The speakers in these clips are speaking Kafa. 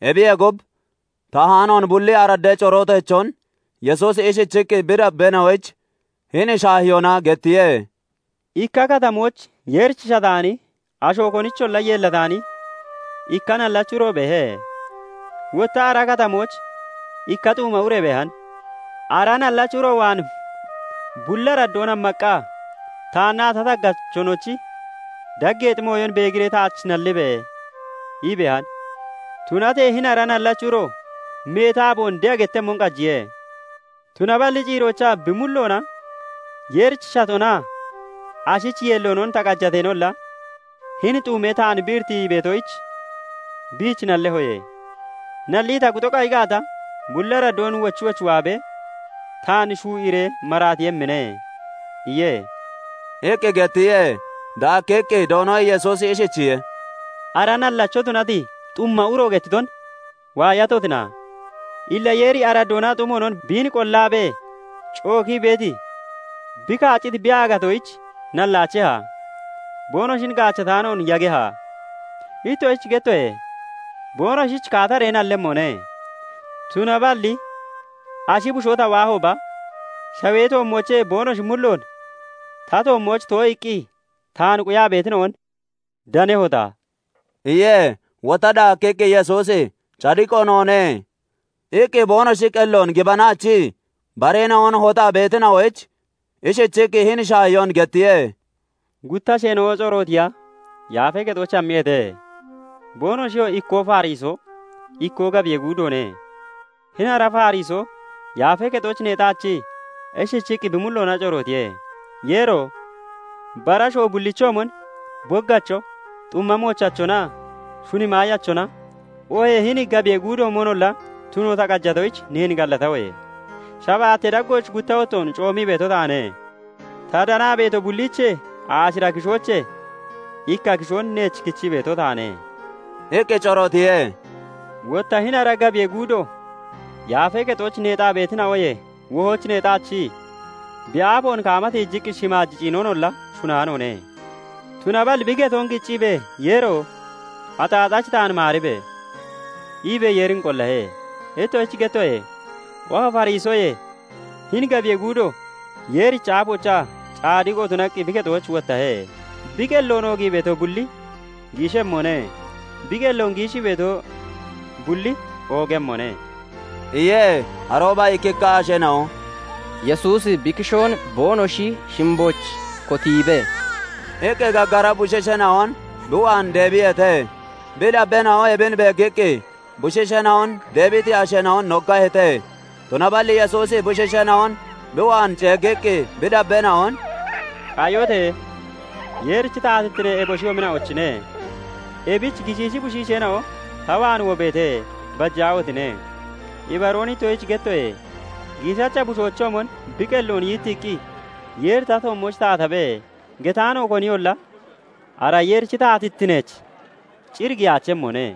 Ebiyee gub, taahaanoon bulli araddee corooteechon Yesuusi ishichiqqi bi dabbeena'oyich hini shaahiyoona gettiye; "Ikka katamooch Yeerich shataani, asho konicholla yeellataani ikka nallachi uro beehe. Wotta ara katamooch ikka xuuma ure beehan; ara nallachi uro waan bulli araddoon hammaqqa, 'Taannaa ta taggachonochi daggeexi mooyon beegiree taach nallibe!' ii beehan. "Tunatee hini ara nallachi uro meeti aaboon de'a gettemmon qajiye; tunaballi ciiroochaa bi mulloona 'Yeerich shatonaa ashich yeelloonon ta qajateenolla, hini xuumee taan bi iritii beetoyich, biich nallehoye; nallii ta kuxo qayi gaata, bulli araddoon wochi wochi waabee taan shuu'iiree maraatiiyemmine' iye" iqqi gettiye. Daakkiqqi Doono Yesuusi ishichiye:- "Ara nallacho tunati xumma uro gettiton waayatotina? Illa Yeeri araddoonaa xumoonon biin qollaabee cookii beeti bi kaacciti bi aagatoyich nallaacheha? Boonoshin gaachataanoon yageha? Ittoshich gettoye; boonoshich kaataree nallemmone. Tunaballi ashi bushoo ta waahooba, shawee toommoochee boonoshi mulloon ta toommooch too'iiqqi taan quyaa beetina'on danehota?" iye. Wotta daakkiqqi Yesuusi "Cadiqo noone" iqqi boonoshi qelloon gibanaachii bareena'on hoxaa beetina'oyich ishichiqqi hini shaahiyoon gettiye; "Gutta asheena'o corootiya Yaafee Kexooch hammiyeete; boonoshiyoo ikkoo Farisoo, ikkoo gabiyee guudoone. Hini ara Farisoo Yaafee Kexooch neexaachii ishichiqqi bi mulloona corootiye; "Yeero! Bara asho bullichoomon, boggacho, xumma moochachonaa shuni maayachona, oohee hini gabiyee guudoomonolla tuno ta qajatoyich, neen gallatahoye. Shabaattee daggooch gutta wottoon coomii beeto taane; ta danaa beeto bulliichee aashira kishoochee ikka kishoon neech kichii beeto taane" iqqi corootiye. "Wotta hini ara gabiyee guudo Yaafee Kexooch neexaa beetina'oyee wohooch neexaachii bi aafoon kaama tiijiqqi shimaaj ciinonolla shunaanoone; tunaballi bi getoon qicciibee, "Yeero! Axaaxachi taan maaribe!" iibee Yeerin qollahe. Ittoshich gettoye; oha Farisoyee hini gabiyee guudo Yeerichi aafoochaa cadiqo tunaqqi bi kexooch wottahe. Bi qelloon oogii beeto bulli giishemmone; bi qelloon giishii beeto bulli oogemmone" iye. Arooba ikkikka asheena'o "Yesuusi bi kishoon boonoshi shimbooch kotiibe" iqqi gaggara bushiisheena'on bi waan deebiyeete; bi dabbeena'o ebin beeggiqqi bushiisheena'on deebiti asheena'on noggaheete. Tunaballi Yesuusi bushiisheena'on bi waan ceeggiqqi, bi dabbeena'on " qayote! Yeerichi taatittine eboshiyoomina'ochine; ebich gishiishi bushiisheena'o ta waan wobeete; bajaahotine! Ibaroon ittoshich gettoye; giishacha bushoochoomon bi qelloon yittiiqqi, 'Yeeri ta toommooch taatabe!' getaano koniyolla ara Yeerichi taatittineech cir giyaachemmone"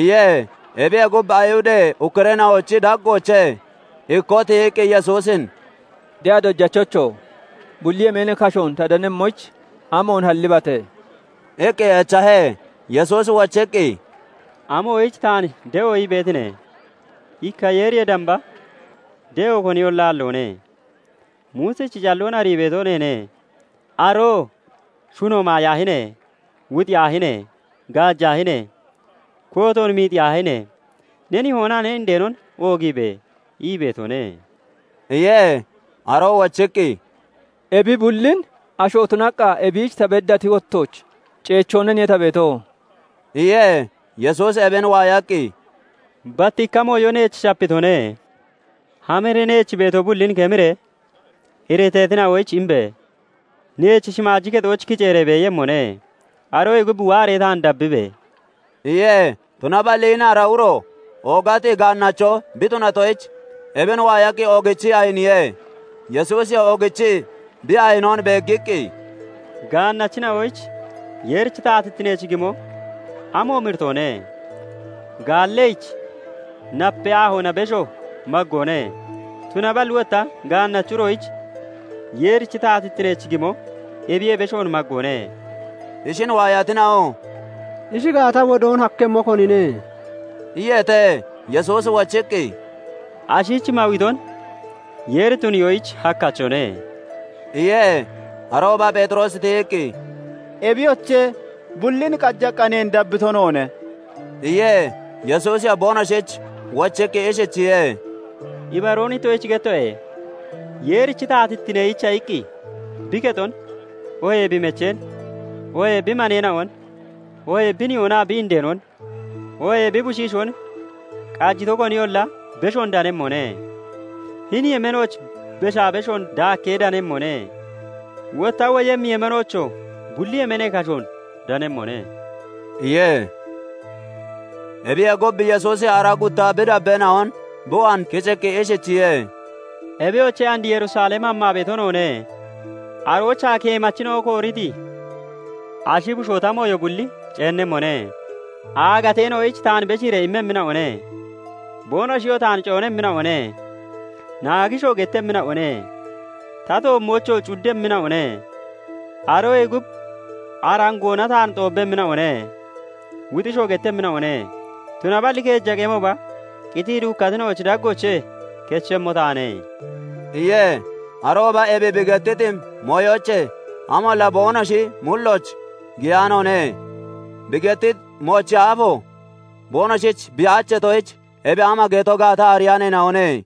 iye. Ebiyee gub, Ayihudee ukkureena'ochi daggoochee ikkoo tiyiqqi Yesuusin "De'a Dojachocho! Bulli yemeenee kashoon ta danemmoyich amoon hallibate?" iqqi echahe. Yesuusi wochiqqi, "Amoyich taan de'o ii beetine? Ikka Yeeriyee damba de'o koniyolla aalloone. Muusichi calloon arii beeto neene; aroo 'Shuno maayaahine! Wuxiyaahine! Gaajaahine! Kootoon miixiyaahine! Ne nihoonaa ne indeenon oogiibe!' ii beetone" iye. Aroo wochiqqi, "Ebi bullin asho tunaqqa ebiich ta beddati wottooch ceechoonaniye ta beeto" iye. Yesuusi ebin waayaqqi, "Bat ikka mooyo neech shapitone; hamiree neech beeto bullin kemiree iriteetina'oyich imbe! Neech shimaaji kexooch kiceeree beeyemmone. Aroyee gub waaree taan dabbibe!" iye. Tunaballi hini ara uro oogati gaannacho bi tunatoyich, ebin waayaqqi oogichii ayiniye. Yesuusiyoo oogichii bi ayinoon beeggiqqi, "Gaannachina'oyich Yeerichi taatittineech gimo amoomi iritoone! Gaalleyich napee aahoona besho maggoone; tunaballi wotta gaannachi uroyich Yeerichi taatittineech gimo ebiyee beshoon maggoone" iye. Ishin waayatina'oo "Ishi gaata, wodoon hakkemmo konine?" iyeete. Yesuusi wochiqqi, "Ashich mawiton Yeeri tuniyoyich hakkachone" iye. Arooba Pheexiroosi tiyiqqi, "Ebiyoche, bullin qajaqqa neen dabbito noone" iye. Yesuusiyoo boonoshich wochiqqi ishichiye:- "Ibaroon ittoshich gettoye; Yeerichi taatittineyicha iqqi bi kexon oohee bi mecheen, oohee bi maneena'on, oohee bi nihoonaa bi indeenon, oohee bi bushiishoon qajito koniyolla, beshoon danemmone; hini yemeenooch beshaa beshoon daakkee danemmone; wotta woyemmi yemeenoochoo bulli yemeenee kashoon danemmone" iye. Ebiyee gub, Yesuusi aaraa gutta bi dabbeena'on bi waan kiciqqi ishichiye:- "Ebiyoche, and Yerusalem hammaa beeto noone; aroochaa keemachina'o kooriti ashi bushoo ta mooyo bulli ceennemmone. Aagateena'oyich taan beshiiree immemmina'one; boonoshiyoo taan coonemmina'one; naagishoo gettemmina'one; ta toommoochoo cuddemmina'one; Aroyee gub arangoona taan xoobbemmina'one; wuxishoo gettemmina'one; tunaballi keeja qemooba qitii duukkatina'ochi daggoochee kechemmo taane" iye. Arooba ebi bi gettiti mooyoochee amolla boonoshi mullooch giyaanoone; bi gettiti moochi aafo boonoshich bi aacheetoyich, ebi ama geto gaata ariyaaneena'one.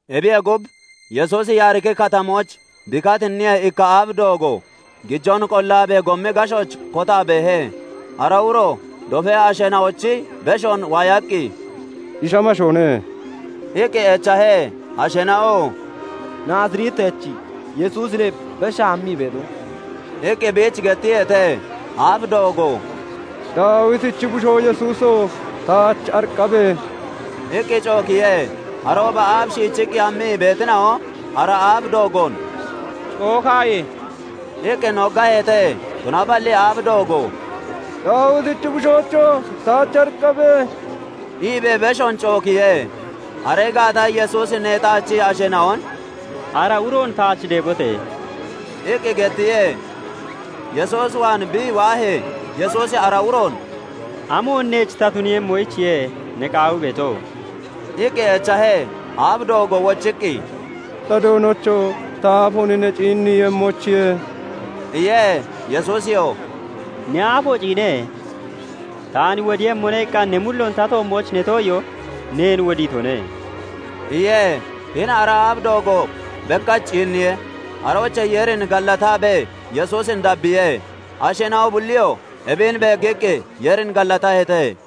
Ebiyee gub, Yesuusi Yaariki Katamooch bi katinniyee, ikka aaf doogo gijoon qollaabee gommi gashooch kotaa beehe. Ara uroo dofee asheena'ochi beshoon waayaqqi, "Ishi amashoone?" iqqi echahe. Asheena'oo "Naazireetachi Yesuusine beshaa hammii beeto" iqqi biich gettiyeete. Aaf doogoo "Daawitichi bushoo Yesuuso! Taach ariqqabe!" iqqi cookiye. Arooba aaf shiichiqqi hammii beetina'o ara aaf doogoon "Cookaaye!" iqqi noggaheete. Tunaballi aaf doogo "Daawitichi bushoocho! Taach ariqqabe!" iibee beshoon cookiye. Aree gaata Yesuusi neexaachii asheena'on "Ara uroon taach deebote!" iqqi gettiye. Yesuus waan bi waahee, Yesuusi ara uroon "Amoon neech ta tuniiyemmoyichiye ne qaawii beeto?" iqqi echahe. Aaf doogoo wochiqqi, "Ta Doonocho! Ta aafoon ne ciinniiemmoyichiye!" iye. Yesuusiyoo "Ne aafo ciine! 'Taan wodiiyemmone' iqqa ne mulloon ta toommooch ne too'iyoo neen wodiitone" iye. Hini ara aaf doogo bekkach ciinniye; aroochee Yeerin gallataabee Yesuusin dabbiye. Asheena'o bulliyoo ebin beeggiqqi Yeerin gallataheete.